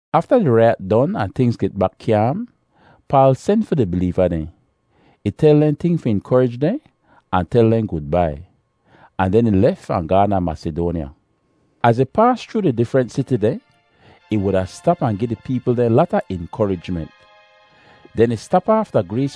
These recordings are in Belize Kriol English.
Afta di raiyat don ahn tingz get bak kyaam, Paal sen fi di bileeva dehn. Ih tel dehn ting fi inkorij dehn ahn tel dehn gudbai, ahn den ih lef ahn gaahn da Masidoanya. Az ih paas chroo di difrent siti dehn, ih wuda stap ahn gi di peepl dehn lata inkorijment. Den ih stap aaf da Grees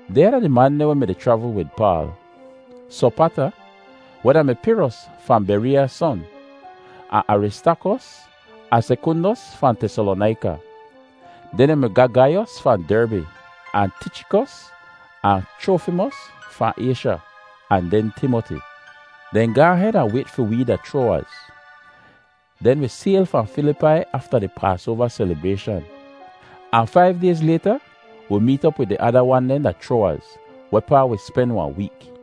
Dehnya da di man dehn weh mi-di chravl wid Paal: Sopata, weh da-mi Piros fahn Bereeya son, ahn Aristaakos ahn Sekundos fahn Tesalonaika. Den yu mi ga Gaiyos fahn Derbi, ahn Tichikos ahn Chrofimos fahn Aysha, ahn den Timoti. Dehn gaahn hed ahn wayt fi wee da Chroawaz. Den wi sayl fahn Filipai afta di Paasoava selibrayshan, ahn faiv dayz layta wi meet op wid di ada wan dehn da Chroawaz, wehpaa wi spen wahn week.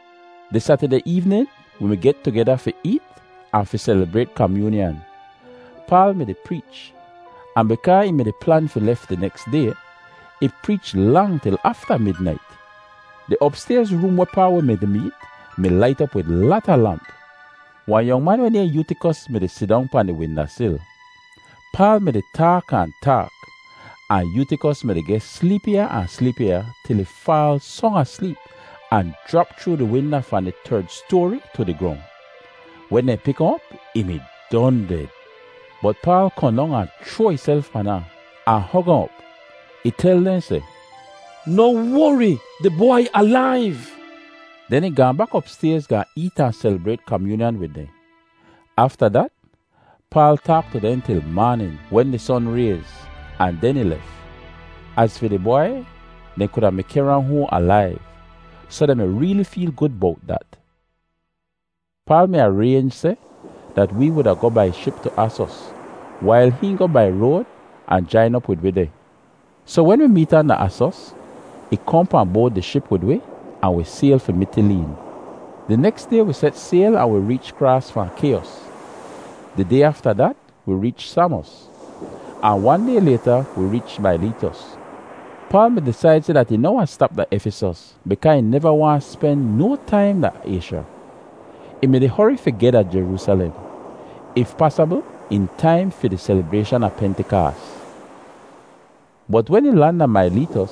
Di Satideh eevnin wi mi get tugeda fi eet ahn fi selibrayt kamyoonyan. Paal mi-di preech, ahn bikaa ih mi-di plan fi lef di neks day, ih preech lang til afta midnait. Di opstayz room wehpaa wi mi-di meet mi lait op wid lata lamp. Wahn yong man weh nayhn Yootikos mi-di sidong pahn di winda sil. Paal mi-di taak ahn taak, ahn Yootikos mi-di geh sleepiya ahn sleepiya til ih faal song asleep ahn jrap chroo di winda fahn di terd stoari tu di grong. Wen dehn pik ahn op, ih mi don ded. Bot Paal kohn dong ahn chroa ihself pan ahn, ahn hog ahn op. Ih tel dehn seh, “Noh wori, di bwai alaiv.” Den ih gaahn bak opstayz gaahn eet ahn selibrayt kamyoonyan wid dehn. Afta dat Paal taak tu dehn til maanin, wen di son rayz, ahn den ih lef. Az fi di bwai, dehn kuda mi kehr ahn hoahn alaiv, soh dehn mi reeli feel gud bowt dat. Paal mi araynj seh dat wee wuda goh bai ship tu Asos wail hihn goh bai road ahn jain op wid wi deh. Soh wen wi meet ahn da Asos, ih kohn pahn boad di ship wid wi ahn wi sayl fi Mitileen. Di neks day wi set sayl ahn wi reech kraas fahn Kyos. Di day afta dat wi reech Samos, ahn wan day layta wi reech Maileetos. Paal mi disaid seh dat ih noh wahn stap da Efisos bikaa ih neva waahn spen no taim da Aysha. Ih mi-di hori fi geh da Jeroosalem, if pasabl, in taim fi di selibrayshan a Pentikaas. Bot wen ih lan da Maileetos,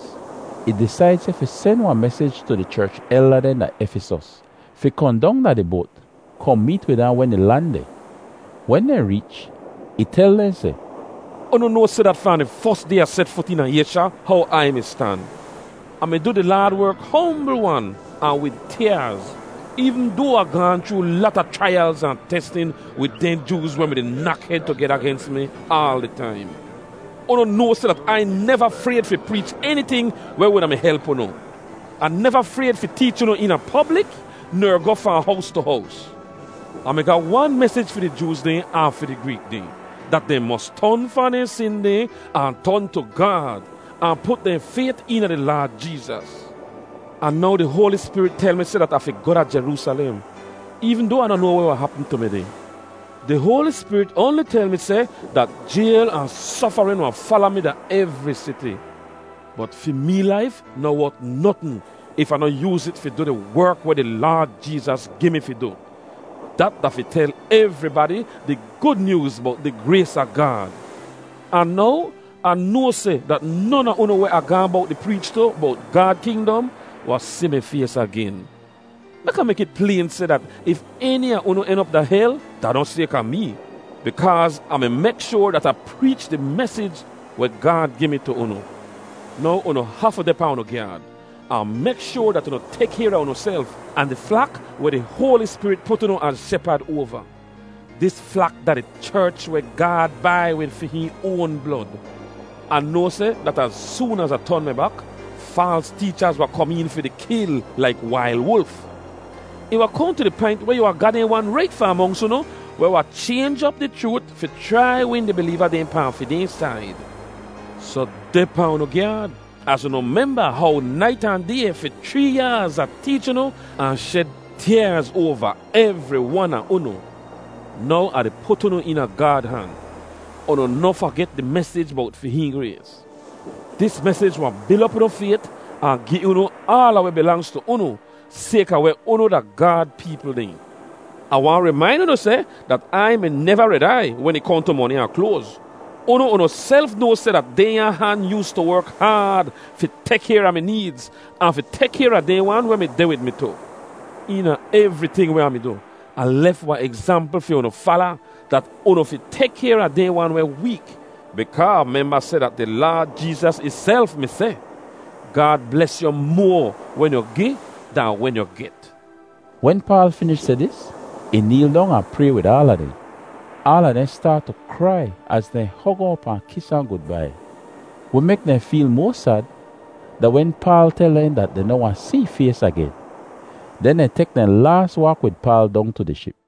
ih disaid seh fi sen wahn mesij tu di cherch elda dehn da Efisos fi kohn dong da di boat, kohn meet wid ahn wen ih lan deh. Wen dehn reech, ih tel dehn seh, “Unu noa seh dat fahn di fos day Ah set fut eena Aysha, how Ai mi stan. Ah mi du di Laad werk hombl-wan ahn wid tyaaz, eevn doa Ah gaahn chroo lata chraiyalz ahn testin wid dehn Jooz weh mi-di nak hed tugeda gens mi aal di taim. Unu noa seh dat Ai neva frayd fi preech eniting weh wuda mi help unu. Ah neva frayd fi teech unu eena poblik ner goh fahn hows tu hows. Ah mi ga wan mesij fi di Jooz dehn ahn fi di Greek dehn—dat dehn mos ton fahn dehn sin dehn ahn ton tu Gaad, ahn put dehn fayt eena di Laad Jeezas. “Ahn now di Hoali Spirit tel mi seh dat Ah fi goh da Jeroosalem, eevn doa Ah noh noa weh wahn hapm tu mi deh. Di Hoali Spirit oanli tel mi seh dat jayl ahn sofarin wahn fala mi da evri siti. Bot fi mee laif noh wot notn if Ah noh yooz it fi du di werk weh di Laad Jeezas gi mi fi du—dat da fi tel evribadi di Gud Nyooz bowt di grays a Gaad. “Ahn now Ah noa seh dat non a unu weh Ah gaahn bowt di preech tu bowt Gaad kingdom wahn si mi fays agen. Mek Ah mek it playn seh dat if eni a unu en op da hel, da noh sayka mee, bikaaz Ah mi mek shoar dat Ah preech di mesij weh Gaad gi mi tu unu. Now unu hafu deh pahn unu gyaad, ahn mek shoar dat unu tek kayr a unuself ahn di flak weh di Hoali Spirit put unu az shepad oava. Dis flak da di cherch weh Gaad bai wid fi hihn oan blod. Ah noa seh dat az soon az Ah ton mi bak, faals teechaz wahn kom een fi di kil laik wail wulf. Ih wahn kohn tu di paint weh yu wahn ga dehn wan rait fahn monks unu weh wahn chaynj op di chroot fi chrai win di bileeva dehn pahn fi dehn said. Soh deh pahn unu gyaad, az unu memba how nait ahn day fi chree yaaz Ah teech unu ahn shed tyaaz oava evri wan a unu. “Now Ah di put unu eena Gaad han. Unu noh faget di mesij bowt fi hihn grays! Dis mesij wahn bil op unu fayt ahn gi unu aala weh bilangz tu unu sayka weh unu da Gaad peepl dehn. Ah waahn rimain unu seh dat Ai mi neva red aiy wen ih kohn tu moni ahn kloaz. Unu unuself noa seh dat dehnya han yoostu werk haad fi tek kayr a mi needz ahn fi tek kayr a dehn wan weh mi deh wid mi tu. Eena evriting weh Ah mi du, Ah lef wahn egzampl fi unu fala dat unu fi tek kayr a dehn wan weh week, bikaa memba seh dat da di Laad Jeezas ihself mi seh, ‘Gaad bles yu moa wen yu gi dahn wen yu get.’” Wen Paal finish seh dis, ih neel dong ahn pray wid aala dehn. Aala dehn staat tu krai az dehn hog ahn op ahn kis ahn gudbai. Weh mek dehn feel moa sad da wen Paal tel dehn dat dehn noh wahn si ih fays agen. Den dehn tek dehn laas waak wid Paal dong tu di ship.